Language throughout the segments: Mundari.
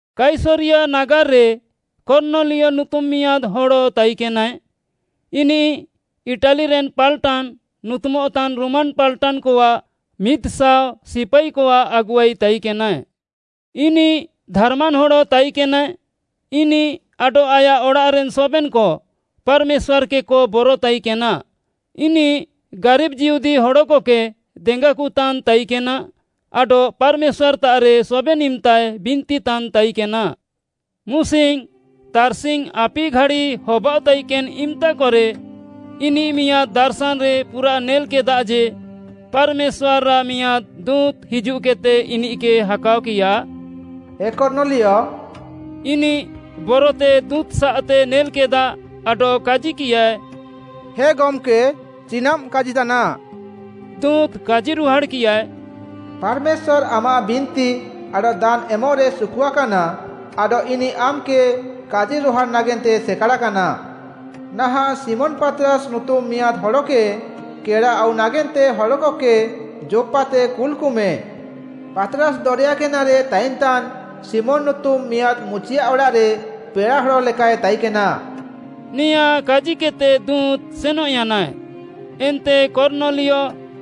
କାଇସରିୟା ନାଗାର୍‌ରେ କର୍ଣ୍ଣଲିୟ ନୁତୁମ୍‌ ମିଆଁଦ୍‌ ହଡ଼ ତାଇକେନାଏ, ଇନିଃ “ଇଟାଲିରେନ୍‌ ପାଲ୍‌ଟାନ୍‌” ନୁତୁମଃତାନ୍‌ ରୋମାନ୍‌ ପାଲ୍‍ଟାନ୍‍କଆଃ ମିଦ୍‌ଶାଅ ସିପାଇକଆଃ ଆଗୁଆଇ ତାଇକେନାଏ। ଇନିଃ ଧାର୍‌ମାନ୍‍ ହଡ଼ ତାଇକେନାଏ। ଇନିଃ ଆଡଃ ଆୟାଃ ଅଡ଼ାଃରେନ୍‌ ସବେନ୍‌କ ପାର୍‌ମେଶ୍ୱାର୍‌‌କେକ ବର ତାଇକେନା। ଇନିଃ ଗାରିବ୍‌ ଯିହୁଦୀ ହଡ଼କକେ ଦେଙ୍ଗାକତାନ୍‌ ତାଇକେନା ଆଡଃ ପାର୍‌ମେଶ୍ୱାର୍‌ତାଃରେ ସବେନ୍‌ ଇମ୍‌ତାଏ ବିନ୍ତିତାନ୍‌ ତାଇକେନା। ମୁସିଙ୍ଗ୍‌ ତାର୍‌ସିଙ୍ଗ୍‌ ଆପି ଘାଡ଼ି ହବାଅଃତାଇକେନ୍‌ ଇମ୍‌ତାକରେ ଇନିଃ ମିଆଁଦ୍‌ ଦାର୍‌ଶାନ୍‌ରେ ପୁରା ନେଲ୍‌କେଦା ଯେ, ପାର୍‌ମେଶ୍ୱାର୍‌ଆଃ ମିଆଁଦ୍‌ ଦୁଁତ୍‌ ହିଜୁଃକେଦ୍‌ତେ ଇନିଃକେ ହାକାଅକିୟା, “ଏ କର୍ଣ୍ଣଲିୟ।” ଇନିଃ ବରତେ ଦୁଁତ୍‌ସାଃତେ ନେଲ୍‌କେଦା ଆଡଃ କାଜିକିୟାଏ, “ହେ ଗମ୍‌କେ, ଚିନାଃମ୍‌ କାଜିତାନା?” ଦୁଁତ୍‌ କାଜିରୁହାଡ଼୍‌କିୟାଏ, “ପାର୍‌ମେଶ୍ୱାର୍‌ ଆମାଃ ବିନ୍ତି ଆଡଃ ଦାନ୍‌ ଏମଃରେ ସୁକୁଆକାନା ଆଡଃ ଇନିଃ ଆମ୍‌କେ କାଜିରୁହାଡ଼୍‌ ନାଗେନ୍ତେ ସେକାଡ଼ାକାନା। ନାହାଁଃ ଶିମୋନ୍‌ ପାତ୍‌ରାସ୍‌ ନୁତୁମ୍‌ ମିଆଁଦ୍‌ ହଡ଼କେ କେଡ଼ାଆଉ ନାଗେନ୍ତେ ହଡ଼କକେ ଯୋପ୍‌ପାତେ କୁଲ୍‌କମେ। ପାତ୍‌ରାସ୍‌ ଦରେୟା ଗେନାରେ ତାଇନ୍‌ତାନ୍‌ ଶିମୋନ୍‌ ନୁତୁମ୍‌ ମିଆଁଦ୍‌ ମୁଚିଆଃ ଅଡ଼ାଃରେ ପେଡ଼ାହଡ଼ ଲେକାଏ ତାଇକେନା।” ନେଆଁ କାଜିକେଦ୍‌ତେ ଦୁଁତ୍‌ ସେନଃୟାନାଏ। ଏନ୍ତେ କର୍ଣ୍ଣଲିୟ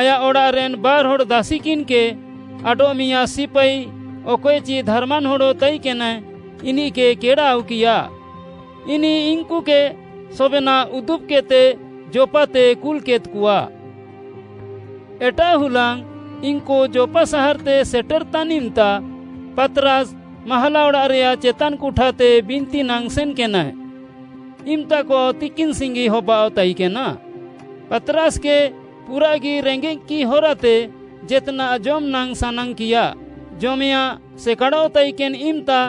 ଆୟାଃ ଅଡ଼ାଃରେନ୍‌ ବାର୍‌ହଡ଼୍‌ ଦାସିକିନ୍‌କେ ଆଡଃ ମିଆଁଦ୍‌ ସିପାଇ, ଅକଏଚି ଧାର୍‌ମାନ୍‌ ହଡ଼ ତାଇକେନାଏ, ଇନିଃକେ କେଡ଼ାଆଉକିୟା। ଇନିଃ ଇନ୍‌କୁକେ ସବେନାଃ ଉଦୁବ୍‍କେଦ୍‌ତେ ଯୋପ୍‌ପାତେ କୁଲ୍‍କେଦ୍‍କଆ। ଏଟାଃ ହୁଲାଙ୍ଗ୍‌ ଇନ୍‌କୁ ଯୋପ୍‌ପା ସାହାର୍‌ତେ ସେଟେରଃତାନ୍‌ ଇମ୍‌ତା ପାତ୍‌ରାସ୍‌ ମାହାଲା ଅଡ଼ାଃରେୟାଃ ଚେତାନ୍‌ କୁଠାତେ ବିନ୍ତି ନାଙ୍ଗ୍‌ ସେନ୍‌କେନାଏ। ଇମ୍‌ତାକ ତିକିନ୍‌ସିଙ୍ଗି ହବାଅଃ ତାଇକେନା। ପାତ୍‌ରାସ୍‌କେ ପୁରାଃଗି ରେଙ୍ଗେଃକିଃ ହରାତେ ଜେତ୍‌ନାଃ ଜମ୍‌ନାଙ୍ଗ୍‌ ସାନାଙ୍ଗ୍‌କିୟା। ଜମେୟାଃଁ ସେକାଡ଼ଃତାଇକେନ୍‌ ଇମ୍‌ତା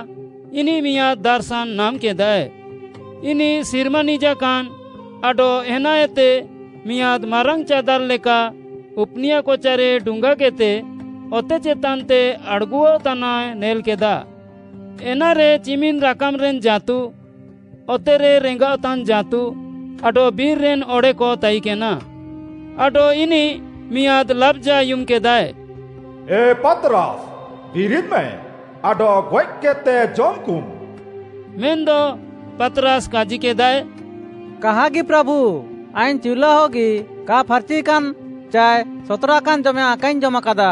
ଇନିଃ ମିଆଁଦ୍‌ ଦାର୍‌ଶାନ୍‌ ନାମ୍‌କେଦାଏ। ଇନିଃ ସିର୍ମା ନିଜାକାନ୍‌ ଆଡଃ ଏନାଏତେ ମିଆଁଦ୍‌ ମାରାଙ୍ଗ୍‌ ଚାଦାର୍‌ ଲେକା ଉପୁନିୟା କଚାରେ ଡୁଙ୍ଗାକେଦ୍‌ତେ ଅତେ ଚେତାନ୍‌ତେ ଆଡ଼୍‌ଗୁଃତାନାଏ ନେଲ୍‌କେଦା। ଏନାରେ ଚିମିନ୍‌ ରାକାମ୍‌ରେନ୍‌ ଜାଁତୁ, ଅତେରେ ରେଙ୍ଗାଅଃତାନ୍‌ ଜାଁତୁ ଆଡଃ ବିର୍‌ରେନ୍‌ ଅଡ଼େକ ତାଇକେନା। ଆଡଃ ଇନିଃ ମିଆଁଦ୍‌ ଲାବ୍‌ଜା ଆୟୁମ୍‌କେଦାଏ, “ଏ ପାତ୍‌ରାସ୍‌, ବିରିଦ୍‌ମେ ଆଡଃ ଗଏଃକେଦ୍‌ତେ ଜମ୍‍କୁମ୍।” ମେନ୍‌ଦ ପାତ୍‌ରାସ୍‌ କାଜିକେଦାଏ, “କାହାଗି, ପ୍ରାଭୁ, ଆଇଙ୍ଗ୍‌ ଚିଉଲାଅଗି କା ଫାର୍‌ଚିୟାକାନ୍‌ ଚାଏ ସତ୍‌ରାକାନ୍‌ ଜମେୟାଁଃ କାଇଙ୍ଗ୍‌ ଜମାକାଦା।”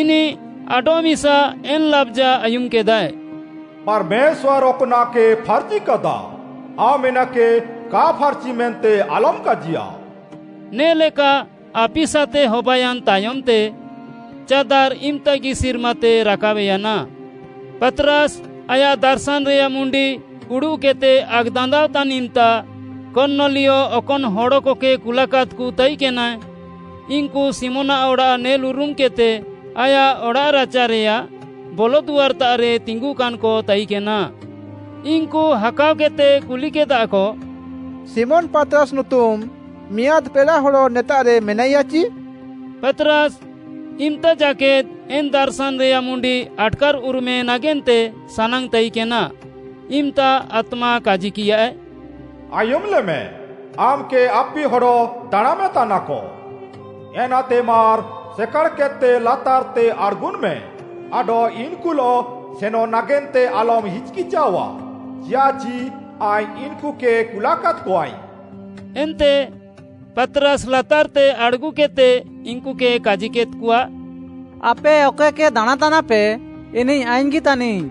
ଇନିଃ ଆଡଃମିସା ଏନ୍‌ ଲାବ୍‌ଜା ଆୟୁମ୍‌କେଦାଏ, “ପାର୍‌ମେଶ୍ୱାର୍‌ ଅକ୍‌ନାଃକେ ଫାର୍‌ଚିକାଦା, ଆମ୍‌ ଏନାକେ କା ଫାର୍‌ଚି ମେନ୍ତେ ଆଲମ୍‌ କାଜିୟା।” ନେ'ଲେକା ଆପିସାତେ ହବାୟାନ୍‌ ତାୟମ୍‌ତେ, ଚାଦାର୍‌ ଇମ୍‌ତାଗି ସିର୍ମାତେ ରାକାବ୍‌ୟାନା। ପାତ୍‌ରାସ୍‌ ଆୟାଃ ଦାର୍‌ଶାନ୍‌ରେୟାଃ ମୁଣ୍ଡି ଉଡ଼ୁଃକେଦ୍‌ତେ ଆକ୍‌ଦାନ୍ଦାଅଃତାନ୍‌ ଇମ୍‌ତା, କର୍ଣ୍ଣଲିୟ ଅକନ୍‌ ହଡ଼କକେ କୁଲାକାଦ୍‌କ ତାଇକେନା, ଇନ୍‌କୁ ଶିମୋନ୍‌ଆଃ ଅଡ଼ାଃ ନେଲ୍‌ଉରମ୍‌କେଦ୍‌ତେ ଆୟାଃ ଅଡ଼ାଃରାଚାରେୟାଃ ବଲଦୁଆର୍‌ତାଃରେ ତିଙ୍ଗୁକାନ୍‌କ ତାଇକେନା। ଇନ୍‌କୁ ହାକାଅକେଦ୍‌ତେ କୁଲିକେଦାକ, “ଶିମୋନ୍‌ ପାତ୍‌ରାସ୍‌ ନୁତୁମ୍‌ ମିଆଁଦ୍‌ ପେଡ଼ାହଡ଼ ନେତାଃରେ ମେନାଇୟାଚି?” ପାତ୍‌ରାସ୍‌ ଇମ୍‌ତାଜାକେଦ୍‌ ଏନ୍‌ ଦାର୍‌ଶାନ୍‌ରେୟାଃ ମୁଣ୍ଡି ଆଟ୍‌କାର୍‌ଉରୁମେ ନାଗେନ୍ତେ ସାନାଙ୍ଗ୍‌ ତାଇକେନା, ଇମ୍‌ତା ଆତ୍ମା କାଜିକିୟାଏ, “ଆୟୁମ୍‌ଲେମ୍‌, ଆମ୍‌କେ ଆପିହଡ଼ ଦାଣାଁମେତାନାକ। ଏନାତେ ମାର୍‌ ସେକାଡ଼୍‌କେଦ୍‌ତେ ଲାତାର୍‌ତେ ଆଡ଼୍‌ଗୁନ୍‌ମେ ଆଡଃ ଇନ୍‌କୁଲଃ ସେନ୍‌ ନାଗେନ୍ତେ ଆଲମ୍‌ ହିଚ୍‌କିଚାଃଅଆ, ଚିଆଃଚି ଆଇଙ୍ଗ୍‌ ଇନ୍‌କୁକେ କୁଲାକାଦ୍‌କଆଇଙ୍ଗ୍‌।” ଏନ୍ତେ ପାତ୍‌ରାସ୍‌ ଲାତାର୍‌ତେ ଆଡ଼୍‌ଗୁକେଦ୍‌ତେ ଇନ୍‌କୁକେ କାଜିକେଦ୍‌କଆ, “ଆପେ ଅକଏକେ ଦାଣାଁତାନାପେ ଇନିଃ ଆଇଙ୍ଗ୍‌ଗି ତାନିଙ୍ଗ୍‌,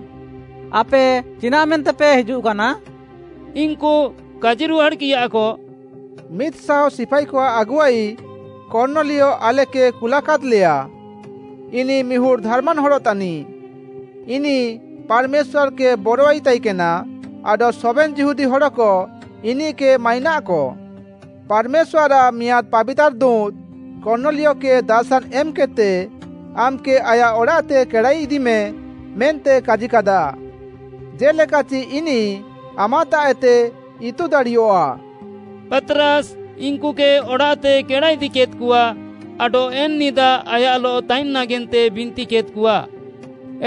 ଆପେ ଚିନାଃ ମେନ୍ତେପେ ହିଜୁଃକାନା?” ଇନ୍‌କୁ କାଜିରୁହାଡ଼୍‌କିୟାକ, “ମିଦ୍‌ଶାଅ ସିପାଇକଆଃ ଆଗୁଆଇ କର୍ଣ୍ଣଲିୟ ଆଲେକେ କୁଲାକାଦ୍‌ଲେୟା। ଇନିଃ ମିହୁଡ଼୍‌ ଧାର୍‌ମାନ୍‌ ହଡ଼ ତାନିଃ। ଇନିଃ ପାର୍‌ମେଶ୍ୱାର୍‌କେ ବରୱାଇ ତାଇକେନା ଆଡଃ ସବେନ୍‌ ଯିହୁଦୀ ହଡ଼କ ଇନିଃକେ ମାଇନାଃକ। ପାର୍‌ମେଶ୍ୱାର୍‌ଆଃ ମିଆଁଦ୍‌ ପାବିତାର୍‌ ଦୁଁତ୍‌ କର୍ଣ୍ଣଲିୟକେ ଦାର୍‌ଶାନ୍‌ ଏମ୍‌କେଦ୍‌ତେ ଆମ୍‌କେ ଆୟାଃ ଅଡ଼ାଃତେ କେଡ଼ାଇଦିମେ ମେନ୍ତେ କାଜିକାଦା, ଜେ'ଲେକାଚି ଇନିଃ ଆମାଃତାଃଏତେ ଇତୁ ଦାଡ଼ିୟଃଆ।” ପାତ୍‌ରାସ୍‌ ଇନ୍‌କୁକେ ଅଡ଼ାଃତେ କେଡ଼ାଇଦିକେଦ୍‌କଆ ଆଡଃ ଏନ୍‌ ନିଦା ଆୟାଃଲଃ ତାଇନ୍‌ ନାଗେନ୍ତେ ବିନ୍ତିକେଦ୍‌କଆ।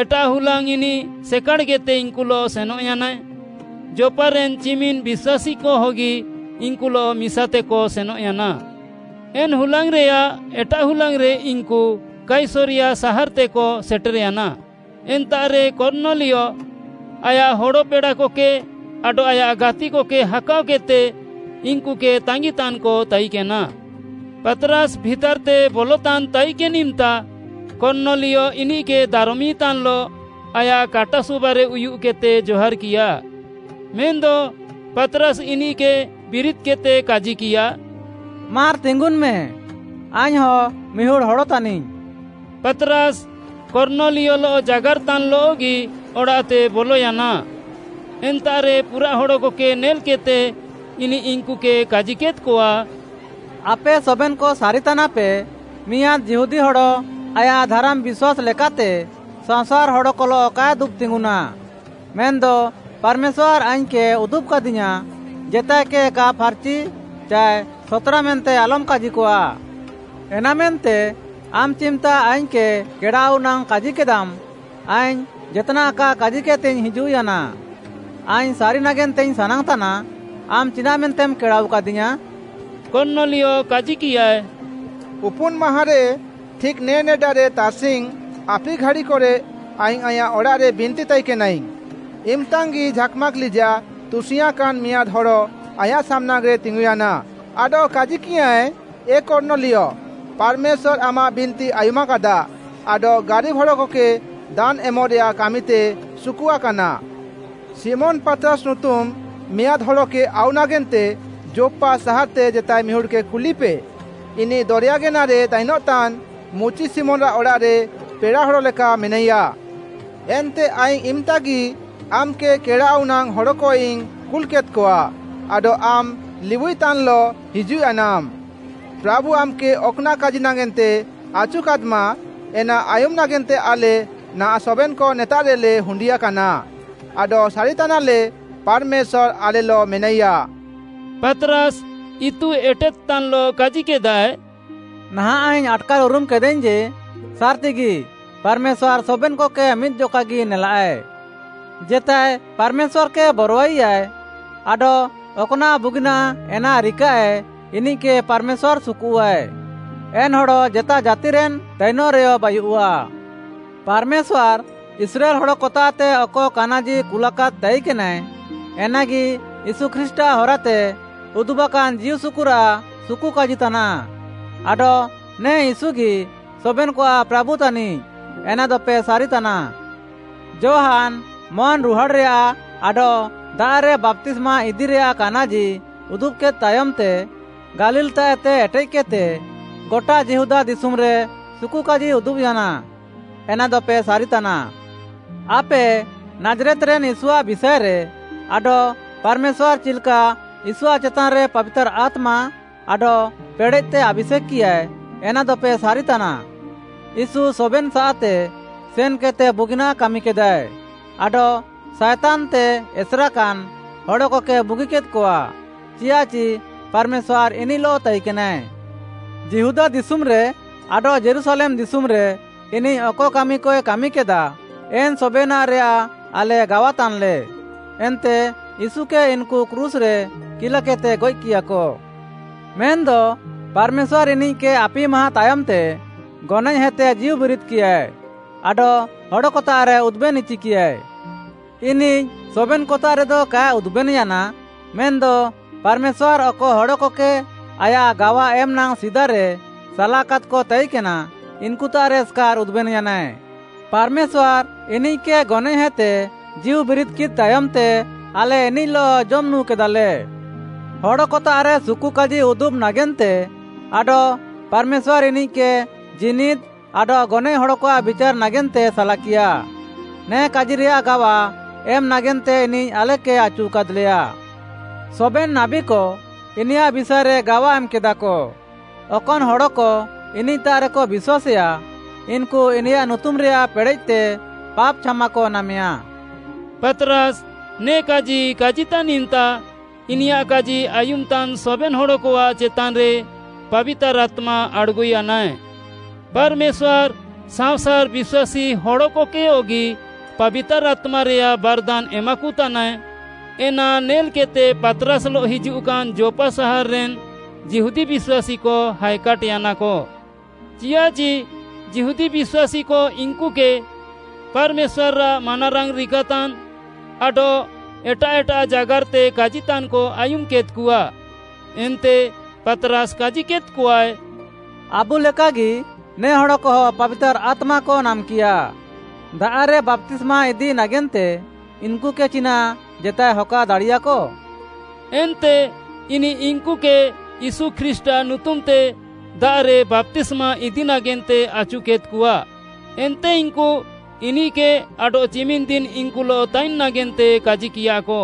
ଏଟାଃ ହୁଲାଙ୍ଗ୍‌ ଇନିଃ ସେକାଡ଼୍‌କେଦ୍‌ତେ ଇନ୍‌କୁଲଃ ସେନଃୟାନାଏ। ଯୋପ୍‌ପାରେନ୍‌ ଚିମିନ୍‌ ବିଶ୍ୱାସୀକହଗି ଇନ୍‌କୁଲଃ ମିସାତେକ ସେନଃୟାନା। ଏନ୍‌ ହୁଲାଙ୍ଗ୍‌ରେୟାଃ ଏଟାଃ ହୁଲାଙ୍ଗ୍‌ରେ ଇନ୍‌କୁ କାଇସରିୟା ସାହାର୍‌ତେକ ସେଟେର୍‌ୟାନା। ଏନ୍ତାଃରେ କର୍ଣ୍ଣଲିୟ ଆୟାଃ ହଡ଼ପେଡ଼ାକକେ ଆଡଃ ଆୟାଃ ଗାତିକକେ ହାକାଅକେଦ୍‌ତେ ଇନ୍‌କୁକେ ତାଙ୍ଗିତାନ୍‌କ ତାଇକେନା। ପାତ୍‌ରାସ୍‌ ଭିତାର୍‌ତେ ବଲତାନ୍‌ ତାଇକେନ୍‌ ଇମ୍‌ତା କର୍ଣ୍ଣଲିୟ ଇନିଃକେ ଦାରମିତାନ୍‌ଲଃ ଆୟାଃ କାଟା ସୁବାରେ ଉୟୁଃକେଦ୍‌ତେ ଜହାର୍‌କିୟା। ମେନ୍‌ଦ ପାତ୍‌ରାସ୍‌ ଇନିଃକେ ବିରିଦ୍‍କେଦ୍‌ତେ କାଜିକିୟା, “ମାର୍‍ ତିଙ୍ଗୁନ୍‍ମେ, ଆଇଙ୍ଗ୍‌ହଁ ମିହୁଡ଼୍‌ ହଡ଼ ତାନିଙ୍ଗ୍‌।” ପାତ୍‌ରାସ୍‌ କର୍ଣ୍ଣଲିୟଲଃ ଜାଗାର୍‍ତାନ୍‍ଲଃଗି ଅଡ଼ାଃତେ ବଲୟାନା। ଏନ୍ତାଃରେ ପୁରାଃ ହଡ଼କକେ ନେଲ୍‌କେଦ୍‌ତେ, ଇନିଃ ଇନ୍‌କୁକେ କାଜିକେଦ୍‌କଆ, “ଆପେ ସବେନ୍‌କ ସାରିତାନାପେ, ମିଆଁଦ୍‌ ଯିହୁଦୀ ହଡ଼ ଆୟାଃ ଧାରାମ୍‌ ବିଶ୍ୱାସ୍‌ ଲେକାତେ ସାଅଁସାର୍‌ ହଡ଼କଲଃ କାଏ ଦୁବ୍‌ତିଙ୍ଗୁନା। ମେନ୍‌ଦ ପାର୍‌ମେଶ୍ୱାର୍‌ ଆଇଙ୍ଗ୍‌କେ ଉଦୁବ୍‌କାଦିୟାଁ, ଜେତାଏକେ କା ଫାର୍‌ଚି ଚାଏ ସତ୍‌ରା ମେନ୍ତେ ଆଲମ୍‌ କାଜିକଆ। ଏନାମେନ୍ତେ ଆମ୍‌ ଚିମ୍‌ତା ଆଇଙ୍ଗ୍‌କେ କେଡ଼ାଆଉ ନାଙ୍ଗ୍‌ କାଜିକେଦାମ୍‌, ଆଇଙ୍ଗ୍‌ ଜେତ୍‌ନାଃ କା କାଜିକେଦ୍‌ତେଇଙ୍ଗ୍‌ ହିଜୁଃୟାନା। ଆଇଙ୍ଗ୍‌ ସାରି ନାଗେନ୍ତେଇଙ୍ଗ୍‌ ସାନାଙ୍ଗ୍‌ତାନା, ଆମ୍‌ ଚିନାଃମେନ୍ତେମ୍‌ କେଡ଼ାଆଉକାଦିୟାଁ?” କର୍ଣ୍ଣଲିୟ କାଜିକିୟାଏ, “ଉପୁନ୍‌ମାହାଁଁରେ ଠିକ୍‌ ନେ ନେଡାରେ ତାର୍‌ସିଙ୍ଗ୍‌ ଆପି ଘାଡ଼ିକରେ ଆଇଙ୍ଗ୍‌ ଆଇଁୟାଃ ଅଡ଼ାଃରେ ବିନ୍ତି ତାଇକେନାଇଙ୍ଗ୍‌। ଇମ୍‌ତାଙ୍ଗି ଝାକ୍‌ମାକ୍‌ ଲିଜାଃ ତୁସିଙ୍ଗ୍‌ୟାଁକାନ୍‌ ମିଆଁଦ୍‌ ହଡ଼ ଆଇଁୟାଃ ସାମ୍‌ନାଙ୍ଗ୍‌ରେ ତିଙ୍ଗୁୟାନା ଆଡଃ କାଜିକିୟାଁଏ, ‘ଏ କର୍ଣ୍ଣଲିୟ, ପାର୍‌ମେଶ୍ୱାର୍‌ ଆମାଃ ବିନ୍ତି ଆୟୁମାକାଦା ଆଡଃ ଗାରିବ୍‌ ହଡ଼କକେ ଦାନ୍‌ ଏମ୍‌ରେୟାଃ କାମିତେ ସୁକୁଆକାନା। ଶିମୋନ୍‌ ପାତ୍‌ରାସ୍‌ ନୁତୁମ୍‌ ମିଆଁଦ୍‌ ହଡ଼କେ ଆଉ ନାଗେନ୍ତେ ଯୋପ୍‌ପା ସାହାର୍‌ତେ ଜେତାଏ ମିହୁଡ଼୍‌କେ କୁଲିପେ। ଇନିଃ ଦରେୟା ଗେନାରେ ତାଇନ୍‌ତାନ୍‌ ମୁଚି ଶିମୋନ୍‌ଆଃ ଅଡ଼ାଃରେ ପେଡ଼ାହଡ଼ ଲେକା ମେନାଇୟା।’ ଏନ୍ତେ ଆଇଙ୍ଗ୍‌ ଇମ୍‍ତାଗି ଆମ୍‌କେ କେଡ଼ାଆଉ ନାଙ୍ଗ୍‌ ହଡ଼କଇଙ୍ଗ୍‌ କୁଲ୍‌କେଦ୍‌କଆ ଆଡଃ ଆମ୍‌ ଲିବୁଇତାନ୍‌ଲଃ ହିଜୁଃୟାନାମ୍‌। ପ୍ରାଭୁ ଆମ୍‌କେ ଅକ୍‌ନାଃ କାଜି ନାଗେନ୍ତେ ଆଚୁକାଦ୍‌ମା, ଏନା ଆୟୁମ୍‌ ନାଗେନ୍ତେ ଆଲେ ନାହାଁଃ ସବେନ୍‌କ ନେତାଃରେଲେ ହୁଣ୍ଡିୟାକାନା ଆଡଃ ସାରିତାନାଲେ ପାର୍‌ମେଶ୍ୱାର୍‌ ଆଲେଲଃ ମେନାଇୟା।” ପାତ୍‌ରାସ୍‌ ଇତୁ ଏଟେଦ୍‌ତାନ୍‌ଲଃ କାଜିକେଦାଏ, “ନାହାଁଃ ଆଇଙ୍ଗ୍‌ ଆଟ୍‌କାର୍‌ ଉରୁମ୍‌କେଦାଇଙ୍ଗ୍‌ ଯେ ସାର୍‌ତିଗି ପାର୍‌ମେଶ୍ୱାର୍‌ ସବେନ୍‌କକେ ମିଦ୍‌ଜକାଗି ନେଲାଃଏ। ଜେତାଏ ପାର୍‌ମେଶ୍ୱାର୍‌କେ ବରୱାଇୟା ଆଡଃ ଅକ୍‌ନାଃ ବୁଗିନାଃ ଏନା ରିକାଃଏ, ଇନିଃକେ ପାର୍‌ମେଶ୍ୱାର୍‌ ସୁକୁଃଆଏ। ଏନ୍‌ ହଡ଼ ଜେତା ଜାତିରେନ୍‌ ତାଇନଃରେୟ ବାୟୁଃଆ। ପାର୍‌ମେଶ୍ୱାର୍‌ ଇସ୍ରାଏଲ୍‌ ହଡ଼କତାଃତେ ଅକ କାନାଜି କୁଲାକାଦ୍‌ ତାଇକେନାଏ, ଏନାଗି ୟୀଶୁ ଖ୍ରୀଷ୍ଟ୍‌ଆଃ ହରାତେ ଉଦୁବାକାନ୍‌ ଜୀଉସୁକୁରାଃ ସୁକୁକାଜି ତାନାଃ ଆଡଃ ନେ ୟୀଶୁଗି ସବେନ୍‌କଆଃ ପ୍ରାଭୁ ତାନିଃ, ଏନାଦପେ ସାରିତାନା। ଯୋହାନ୍‌ ମନ୍‌ରୁହାଡ଼୍‌ରେୟାଃ ଆଡଃ ଦାଆଃରେ ବାପ୍ତିସ୍ମା ଇଦିରେୟାଃ କାନାଜି ଉଦୁବ୍‌କେଦ୍‌ ତାୟମ୍‌ତେ, ଗାଲିଲ୍‌ତାଃଏତେ ଏଟେଃକେଦ୍‌ତେ ଗଟା ଯିହୁଦା ଦିଶୁମ୍‌ରେ ସୁକୁକାଜି ଉଦୁବ୍‌ୟାନା, ଏନାଦପେ ସାରିତାନା। ଆପେ ନାଜ୍‌ରେତ୍‌ରେନ୍‌ ୟୀଶୁଆଃ ବିଷାଏରେ ଆଡଃ ପାର୍‌ମେଶ୍ୱାର୍‌ ଚିଲ୍‌କା ୟୀଶୁଆଃ ଚେତାନ୍‌ରେ ପାବିତାର୍‌ ଆତ୍ମା ଆଡଃ ପେଡ଼େଃତେ ଆଭିଷେକ୍‌କିୟାଏ, ଏନାଦପେ ସାରିତାନା। ୟୀଶୁ ସବେନ୍‌ସାଃତେ ସେନ୍‌କେଦ୍‌ତେ ବୁଗିନାଃ କାମିକେଦାଏ ଆଡଃ ସାଏତାନ୍‌ତେ ଏସେରାକାନ୍‌ ହଡ଼କକେ ବୁଗିକେଦ୍‌କଆ, ଚିଆଃଚି ପାର୍‌ମେଶ୍ୱାର୍‌ ଇନିଃଲଃ ତାଇକେନାଏ। ଯିହୁଦା ଦିଶୁମ୍‌ରେ ଆଡଃ ଯୀରୁଶାଲେମ୍‌ ଦିଶୁମ୍‌ରେ ଇନିଃ ଅକ କାମିକଏ କାମିକେଦା, ଏନ୍‌ ସବେନାଃରେୟାଃ ଆଲେ ଗାୱାତାନ୍‌ଲେ। ଏନ୍ତେ ୟୀଶୁକେ ଇନ୍‌କୁ କ୍ରୁଶ୍‌ରେ କିଲାକେଦ୍‌ତେ ଗଏଃକିୟାକ। ମେନ୍‌ଦ ପାର୍‌ମେଶ୍ୱାର୍‌ ଇନିଃକେ ଆପିମାହାଁ ତାୟମ୍‌ତେ ଗନଏଃହେତେ ଜୀଉବିରିଦ୍‌କିୟା ଆଡଃ ହଡ଼କତାଃରେ ଉଦୁବେନ୍‌ଇଚିକିୟା। ଇନିଃ ସବେନ୍‌କତାଃରେଦ କାଏ ଉଦୁବେନ୍‌ୟାନା, ମେନ୍‌ଦ ପାର୍‌ମେଶ୍ୱାର୍‌ ଅକ ହଡ଼କକେ ଆୟାଃ ଗାୱା ଏମ୍‌ନାଙ୍ଗ୍‌ ସିଦାରେ ସାଲାକାଦ୍‌କ ତାଇକେନା, ଇନ୍‌କୁତାଃରେ ଏସ୍‌କାର୍‌ ଉଦୁବେନ୍‌ୟାନାଏ। ପାର୍‌ମେଶ୍ୱାର୍‌ ଇନିଃକେ ଗନଏଃହେତେ ଜୀଉବିରିଦ୍‌ୟାନ୍‌ ତାୟମ୍‌ତେ ଆଲେ ଇନିଃଲଃ ଜମ୍‌ ନୁଁକେଦାଲେ। ହଡ଼କତାଃରେ ସୁକୁକାଜି ଉଦୁବ୍‌ ନାଗେନ୍ତେ ଆଡଃ ପାର୍‌ମେଶ୍ୱାର୍‌ ଇନିଃକେ ଜୀନିଦ୍‌ ଆଡଃ ଗନଏଃ ହଡ଼କଆଃ ବିଚାର୍‌ ନାଗେନ୍ତେ ସାଲାକିୟା, ନେ କାଜିରେୟାଃ ଗାୱା ଏମ୍‌ ନାଗେନ୍ତେ ଇନିଃ ଆଲେକେ ଆଚୁକାଦ୍‌ଲେୟା। ସବେନ୍‌ ନାବୀକ ଇନିୟାଃ ବିଷାଏରେ ଗାୱା ଏମ୍‌କେଦାକ, ଅକନ୍‌ ହଡ଼କ ଇନିଃତାଃରେକ ବିଶ୍ୱାସେୟା, ଇନ୍‌କୁ ଇନିୟାଃ ନୁତୁମ୍‌ରେୟାଃ ପେଡ଼େଃତେ ପାପ୍‌ ଛାମାକ ନାମେୟା।” ପାତ୍‌ରାସ୍‌ ନେ କାଜି କାଜିତାନ୍ ଇମ୍‌ତା, ଇନିୟାଃ କାଜି ଆୟୁମ୍‌ତାନ୍‌ ସବେନ୍‌ ହଡ଼କଆଃ ଚେତାନ୍‌ରେ ପାବିତାର୍‌ ଆତ୍ମା ଆଡ଼୍‌ଗୁୟାନାଏ। ପାର୍‌ମେଶ୍ୱାର୍‌ ସାଅଁସାର୍‌ ବିଶ୍ୱାସୀ ହଡ଼କକେୟଗି ପାବିତାର୍‌ ଆତ୍ମାରେୟାଃ ବାର୍‌ଦାନ୍‌ ଏମାକତାନାଏ, ଏନା ନେଲ୍‌କେଦ୍‌ତେ ପାତ୍‌ରାସ୍‌ଲଃ ହିଜୁଃକାନ୍‌ ଯୋପ୍‌ପା ସାହାର୍‌ରେନ୍‌ ଯିହୁଦୀ ବିଶ୍ୱାସୀକ ହାଏକାଟ୍‍ୟାନାକ। ଚିଆଃଚି ଯିହୁଦୀ ବିଶ୍ୱାସୀକ ଇନ୍‌କୁକେ ପାର୍‌ମେଶ୍ୱାର୍‌ଆଃ ମାନାରାଙ୍ଗ୍‌ ରିକାତାନ୍‌ ଆଡଃ ଏଟାଃ ଏଟାଃ ଜାଗାର୍‌ତେ କାଜିତାନ୍‌କ ଆୟୁମ୍‌କେଦ୍‌କଆ। ଏନ୍ତେ ପାତ୍‌ରାସ୍‌ କାଜିକେଦ୍‌କଆଏ, “ଆବୁ ଲେକାଗି ନେ ହଡ଼କହ ପାବିତାର୍‌ ଆତ୍ମାକ ନାମ୍‌କିୟା। ଦାଆଃରେ ବାପ୍ତିସ୍ମା ଇଦି ନାଗେନ୍ତେ ଇନ୍‌କୁକେ ଚିନାଃ ଜେତାଏ ହକା ଦାଡ଼ିୟାଃକ?” ଏନ୍ତେ ଇନିଃ ଇନ୍‌କୁକେ ୟୀଶୁ ଖ୍ରୀଷ୍ଟ୍‌ଆଃ ନୁତୁମ୍‌ତେ ଦାଆଃରେ ବାପ୍ତିସ୍ମା ଇଦି ନାଗେନ୍ତେ ଆଚୁକେଦ୍‌କଆ। ଏନ୍ତେ ଇନ୍‌କୁ ଇନିଃକେ ଆଡଃ ଚିମିନ୍‌ ଦିନ୍‌ ଇନ୍‌କୁଲଃ ତାଇନ୍‌ ନାଗେନ୍ତେ କାଜିକିୟାକ।